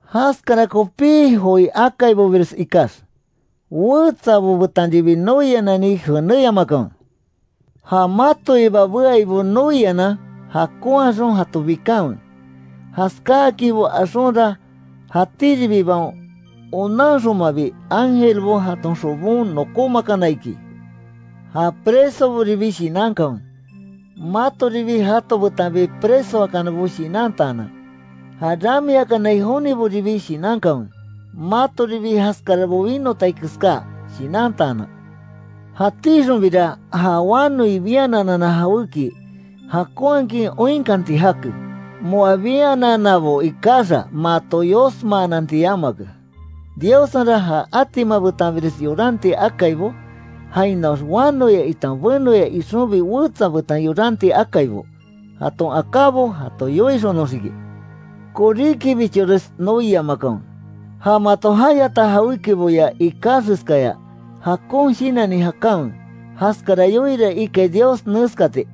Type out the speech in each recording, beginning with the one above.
Jaskara kopí joi akaibobires ikax, wetsabo betanribi noianani jenéyamakanwe. Ja matoiba beaibo noianan, jakonhaxon jato bikanwe, jaskáakinbo axonra, jatíribibaon onanxonmabi, ángelbo jaton xobon nokómakana iki. Ja presoboribi shinankanwe, matoribi jato betanbi presoakanabo shinantaanan; ja ramiakanai joniboribi shinankanwe, matoribi jaskarabo winotai keská, shinantaanan. Jatíxonbira ja wanoi biananana jawéki, jakonhakin oinkanti jake, moa biananabo ikaxa, mato yosmaananti yamake. Diossenra, ja atima betanbires yoranti akaibo, jainoax wanoya itan benoya ixonbi wetsa betan yoranti akaibo, jaton akábo jato yoixonoxiki. Koríkibichores noiamakanwe, ja mato jayata jawékiboya ikaxeskaya, jakon shinanni jakanwe. Jaskara yoiira ikai Dios neskati: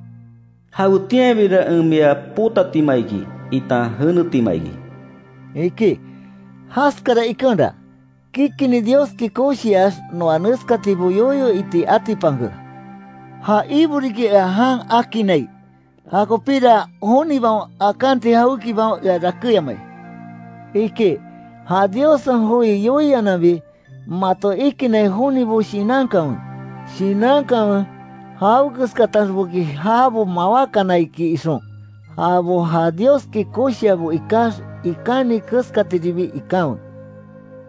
“Jawetianbira en mia potatima iki itan jenetima iki”, iki. Jaskara ikenra, kikinni Dioski koshiax noa neskatibo yoyo iti atipanke: “Ja Ibo riki ea jan akinnai, jakopíra, jonibaon akanti jawékibaon ea rakéyamai”, iki. Ja Diossen joi yoiananbi, mato ikinnai jonibo shinankanwe, Shinankanwe, jawekeskataxboki jabo mawákana iki ixon. Jabo ja Dioski koshiabo ikax, ikáni keskatiribi ikanwe.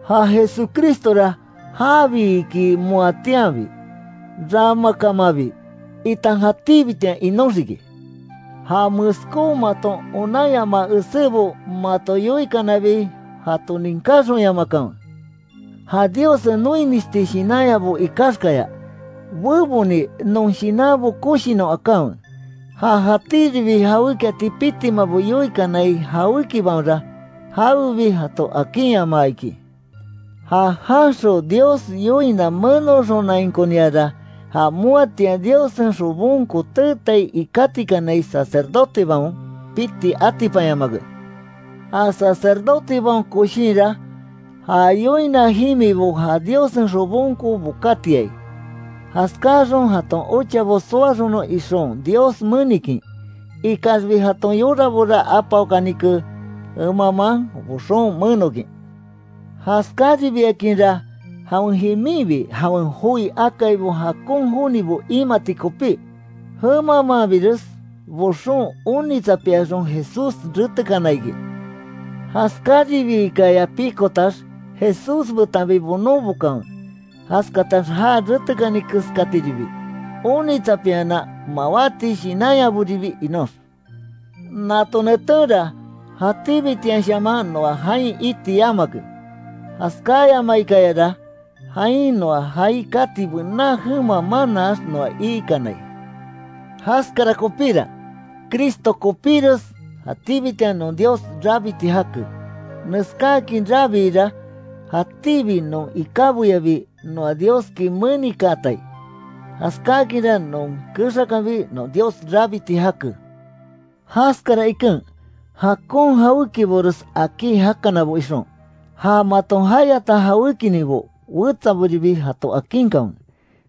Ja Jesucristora jabi iki moatianbi, ramakamanbi itan jatíbitian inóxiki. Ja meskó maton onanyamaa esébo mato yoikanabi jato ninkáxonyamakanwe. Ja Diossen noimisti shinanyabo ikaxkaya, beboni non shinanbo koshinon akanwe. Ja jatíribi jawékiati pitimabo yoikanai jawékibaonra, jawebi jato akinyamaa iki. Ja janxon Dios yoina menoxonainkoniara, ja moatian Diossen xobonko teetai ikátikanai sacerdotebaon, piti atipanyamake. Ja sacerdotebaon koshinra, ja yoina jimibo ja Diossen xobonko bokatiai, jaskáxon jaton ochabo soaxonon ixon Dios menikin, ikaxbi jaton yorabora apaokanike, jemamaan boxon menokin. Jaskáribiakinra jawen jiminbi jawen joi akaibo jakon jonibo imati kopí, jemamaanbires boxon onitsapiaxon Jesús retekana iki. Jaskáribiikaya pikotax, Jesús betanbi bonon bokanwe, jaskatax já retekani keskatiribi, onitsapianan mawáti shinanyaboribi inox. Nato netenra, jatíbitianshaman noa jain iti yamake, jaskáyamaikayara, jain noa jaai kati bená jema manaax noa ikanai. Jaskara kopíra, Cristo kopíres jatíbitian non Dios rabiti jake, neskáakin rabiira, jatíbi non ikáboyabi noa Dioski menikaatai, jaskáakinra non kexakanbi non Dios rabiti jake. Jaskara iken, jakon jawékibores akí jakanabo ixon, ja mato jayata jawékininbo, wetsaboribi jato akinkanwe.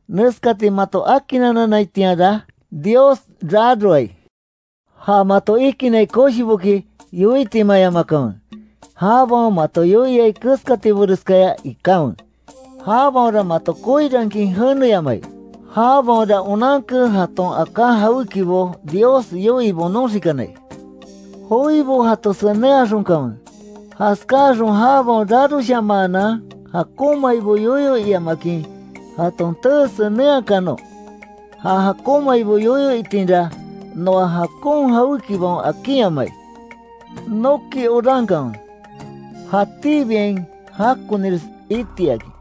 Neskati mato akinanannaitianra, Dios raroai. Ja mato ikinnai koshiboki yoitimayamakanwe, jabaon mato yoiai keskatiboreskaya ikanwe, jabaonra mato koirankin jeneyamai. Jabaonra onanke jaton aká jawékibo Dios yoii bonoxikanai; joibo jato senenhaxonkanwe, jaskáxon jabaon raroshamaanan jakonmaibo yoyo iamakin jaton tee senenhakanon. Ja jakonmaibo yoyo itinra, noa jakon jawékibaon akinyamai. Noki orankanwe, jatíbiain jakonires itiakin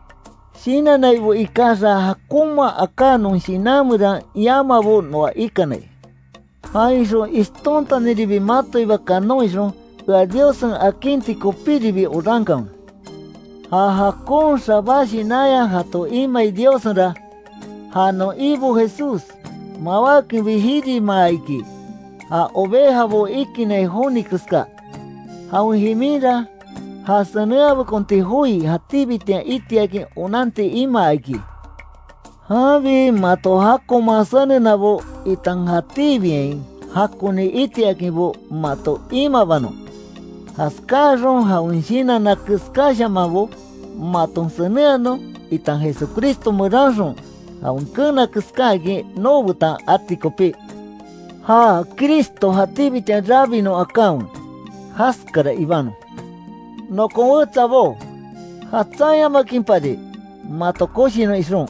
shinannaibo ikaxa, jakonma aká non shinan meran yamabo noa ikanai. Jainxon ishtontaniribi matoiba kanon ixon, ea Diossen akinti kopíribi orankanwe. Ja jakon xabá shinanya jato imai Diossenra, ja non Ibo Jesús, mawákenbi jirimaa iki, ja ovejabo ikinnai joni keska, jawen jiminra ja senenhabekonti joi jatíbitian itiakin onanti imaa iki. Janbi mato jakonman senenabo, itan jatíbiain jakoni itiakinbo mato imabanon; jaskáaxon jawen shinanna keskáshamanbo, maton senenhanon, itan Jesucristo meranxon jawen keena keskáakin, noobetan ati kopí. Ja Cristo jatíbitian rabinon akanwe, jaskara ibanon. Nokon wetsabó jatsanyamakinpari, mato koshinon ixon,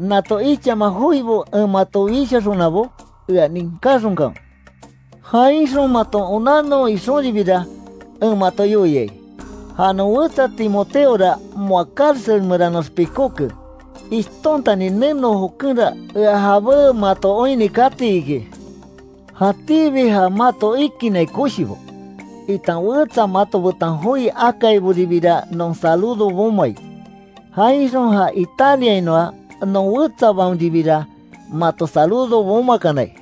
nato ichama joibo en mato wishaxonabo, ea ninkáxonkanwe. Jainxon maton onannon ixonribira, en mato yoiai, ja non wetsa Timoteora moa cárcel meranoax pikóke, ishtontani neno jokenra, ea jabé mato oinni kati iki. Jatíbi ja mato ikinnai koshibo, itan wetsa mato betan joi akaiboribira non saludo bomai, jainxon ja Italiainoa non wetsabaonribira, mato saludo bomakanai.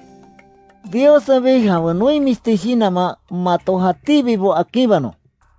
Diossenbi jawen noimisti shinanman mato jatíbibo akinbanon.